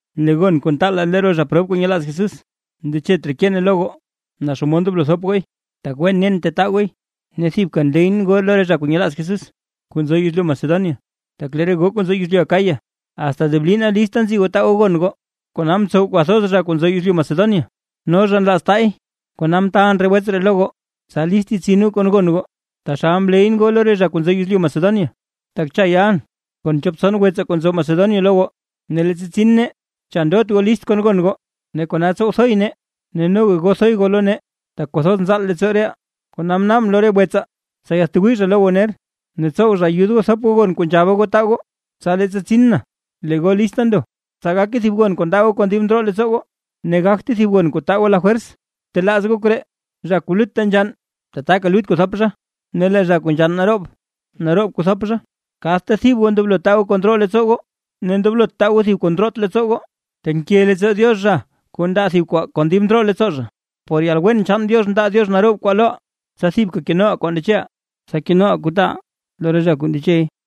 Lee gon kuu ntaalaa lo re zha prob kuu nyelaaz Jesús, ndechet raa keen lo goo naa xomod ndoblo thop gooy, tak wen nen tetaa gooy. Ne thibka nleyʼn goo lo re zha kuu nyelaaz Jesús kuu nzo yezlyu Macedonia, tak lee re goo kuu nzo yezlyu Acaya asta deblina lista nzi goo taa goo gon goo; kona mtsow kwathoz zha kuu nzo yezlyu Macedonia, no zha nlaaza zha taa zhay. Kona mtaalʼn re wets ree lo goo, tsa list yetsin goo kon gon goo, taxal mleyʼn goo lo re zha kuu nzo yezlyu Macedonia, tak cha yalʼn kon chop tson wetsaa kuu nzo Macedonia lo goo, ne leettsa tsin nee, cha ndot goo list kon gon goo, ne kona tsow thoy nee ne noga goo thoy goo lo nee, tak kwathoz nzaal leettsooʼaa reʼaa. Kona mnaabʼn lo re wetsaa, tsa yaatwii zha lo goo ner, ne tsow zha ayud goo thop goo gon kuu nzhaba goo taa goo. Tsa leettsa tsin na lee goo lista ndo, tsa gake thib gon kuu ndaa goo kon dib ndroo leettsoo goo, ne gagte thib gon kuu taa goo lafwers. Btelaaz goo koree: “Zha kuu lutta nzhann, tataka lut kuu thop zha; ne lee zha kuu nzhann naroob, naroob kuu thop zha”. Kadta thib goo ndoblo taa goo kuu ndroo leettsoo goo, ne ndoblot taa goo thib kuu ndroot leettsoo goo, tak nke leettsoo Diox zha, kuu ndaa thib kwaa kon dib ndroo leettsoo. Por yalwen chaan Diox ndaa Diox naroob kwaa loʼaa, tsa thibka kenoʼaa kuu ndecheʼaa, ne tsa kenoʼaa kuu taaʼaa lo re zha kuu ndechey.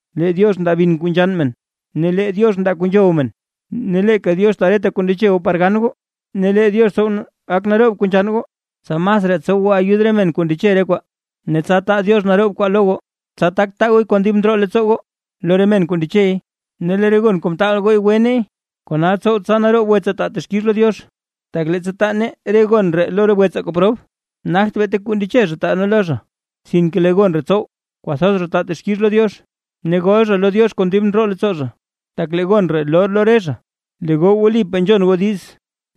Lee Diox ndaa bin kuu nzhann men, ne lee Diox ndaa kuu nzhow men, ne leeka Diox taa reta kuu ndeche goo par gan goo; ne lee Diox tsow gak naroob kuu nzhann goo, tsa masraa tsow goo ayud re men kuu ndeche re kwaa. Ne tsa taa Diox naroob kwaa lo goo, tsa tak taa gooy kon dib ndroo leettsoo goo lo re men kuu ndechey. Ne lee re gon kuu taal goo gwe neey, kona tsow tsa naroob wetsaa taa texkix lo Diox. Tak leettsa taa nee gon ree lo re wetsaa kuu prob, nagt beeta kuu ndeche zha taa nee lo zha, sinke lee gon ree tsow kwathoz taa zha texkix lo Diox. Ne gol zha lo Diox kon dib ndroo leettsoo zha, tak lee gon ree loo lo re zha lee goo wlipaa nzhon goo diiz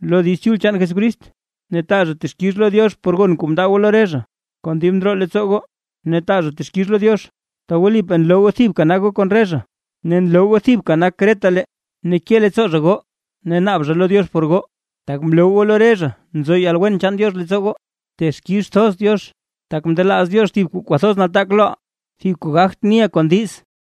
lo Diiz Chul chaan Jesucrist; ne taa zha texkix lo Diox por gon kuu mndaa goo lo re zha kon dib ndroo leettsoo goo, ne taa zha texkix lo Diox, tak wlipaa nloo goo thibka nak goo kon re zha ne nloo goo thibka nak retalee. Ne ke leettsoo zha goo ne naab zha lo Diox por goo, tak mloo goo lo re zha nzo yalwen chaan Diox leettsoo goo. ¡Texkix thoz Diox, tak mndelaaz Diox thib kuu kwathoz nataak loʼaa, thib kuu gagt niʼaa kon diiz!